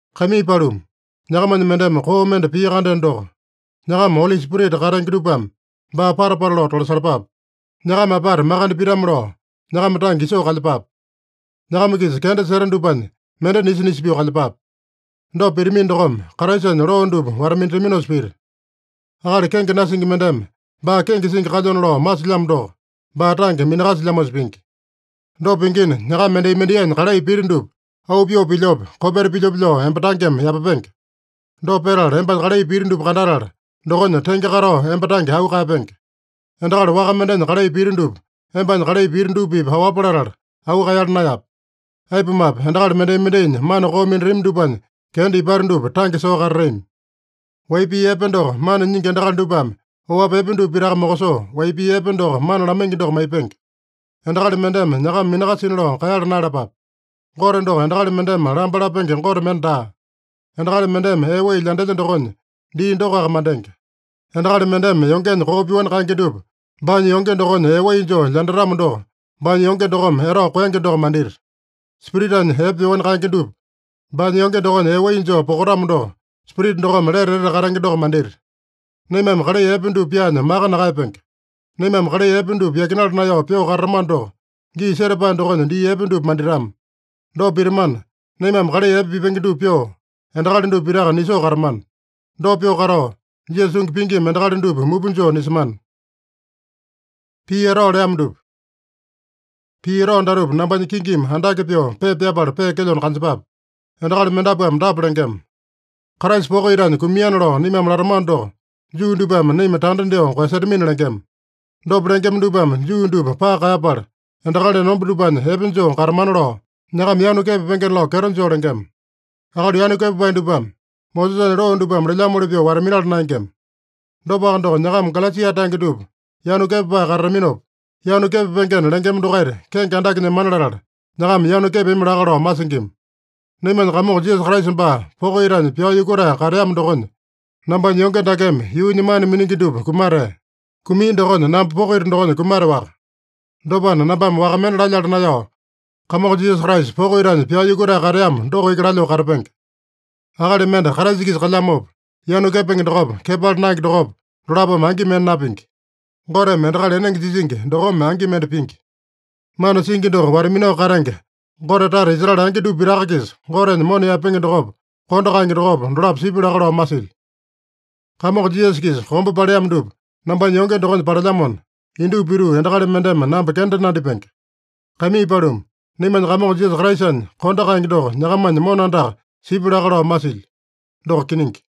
Kaimii paluma, nyakamanya mendeme koo mende pia-kandeno doko, nyakama Oli Spirita katenge dupame baa pata-pata lao tolasalapape. Nyakama apata makande pitame-lao, nyakama tange isoo kalyepape. Nyakama-kisa kenda seta dupanya mende nisa-nisa pyoo kalyepape. Dopa pitamino dokome, Kraisanya loo dupa wata-minataminosa pita. Akali kenge nasingi mendeme baa kenge singi kalyona lao masilyamo doko, baa tange minakasilyamosa pingi. Dopa pingina, nyakama mendai-mendainya kalai piti dupa auu pyoo pilyope, kopeta pilyope lao emba tangeme yapapenge. Dopa petala, embanya kalai piti dupa kandatala, dokonya tenge katao emba tange auu kaeyapenge. Endakali waka mendenya kalai pita dupa, embanya kalai piti dupa-pipa aowapa latala, auu kaeyala naeyape. Aipumape, endakali mendai-mendainya mana koo minatami dupanya kenda ipata dupa tange soo katatami. Wai pii epe doko mana nyingi endakali dupame oapi epe dupa pitaka mokosoo, wai pii epe doko mana lamaingi doko maipenge. Endakali mendeme nyakama minakasina lao kaeyala naeyalapape. Gote doko endakali mendeme lamba lapenge Gote mende daa. Endakali mendeme ee wai lyandelya dokonya, dii dokoaka mandenge. Endakali mendeme yongenya koo pyoani kaenge dupa baanya yonge dokonya ee wai joo lyandatamo doko, baanya yonge dokome etao koenge doko mandita. Spiritanya epe pyoani kaenge dupa baanya yonge dokonya ee wai joo pokatamo doko, Spirita dokome lete etete katenge doko mandita. Naimame kalai epe dupa pyaanya maka nakaeyapenge. Naimame kalai epe dupa yakinala naeyao pyoo katatamano doko, gii setapae dokonya dii epe dupa manditama. Dopa pitamana, naimame kalai epe pipenge dupa pyoo, endakali dupa pitaka nisoo katamana. Dopa pyoo katao, Jisasa tungi pingima endakali dupa mupa joo nisemana. Pii etao datupa nambanya kingimi andake pyoo pepa pyapala peekelyona kanjepape. Endakali mendapuame dapa lengema: “Kraisa poko itanya kumiana lao naimame latamano doko, Juu dupame naima tanda dyoo koeyasetamina” lengema. Dopa lengema dupame Juu dupa paka kaeyapala, endakali enomba dupanya epe joo katamana lao, nyakama yanu kepapengena lao kyeto joo lengema. Akali yanu kepapae dupame Mosesanya loo dupame lelyamoli pyoo wata-minala naengema. Dopaka doko, nyakama Galesia tange dupa yanu kepapae katataminopa, yanu kepapengena lengema dokaita kenge andake nyemana latala, nyakama yanu kepami laka lao masingima. Naimanya Kamongo Jisasa Kraisa baa poko itanya pyao yukutae kateamo dokonya, nambanya yonge dakeme yuunya mana miningi dupa kumatea. Kumia dokonya namba poko ita dokonya kumateowaka. Dopana, nambame waka mende lalyala naeyao, Kamongo Jisasa Kraisa poko itanya pyao yukutae kateamo doko iki lalyoo katapenge. Akali mende Kraisa-kisa kalyamopa, yanu kepenge dokopa, kepala naenge dokopa, dolapome angi mende napingi. Goteme endakali enenge jisingi dokome angi mende pingi. Mana singi doko wata-minao katenge, Gote tata Israele angi dupa pitaka-kisa Gotenya mona yaepenge dokopa, kondo kaenge dokopa, dolapo sipya laka lao masilyo. Kamongo Jisasa-kisa kombe paleamo dupa nambanya yonge dokonya palelyamona, indupa pituu endakali mendeme namba kenda nandipenge. Kaimii paluma, naimanya Kamongo Jisasa Kraisanya kondo kaenge doko nyakamanya mona andaka sipya laka lao masilyo. Doko kiningi.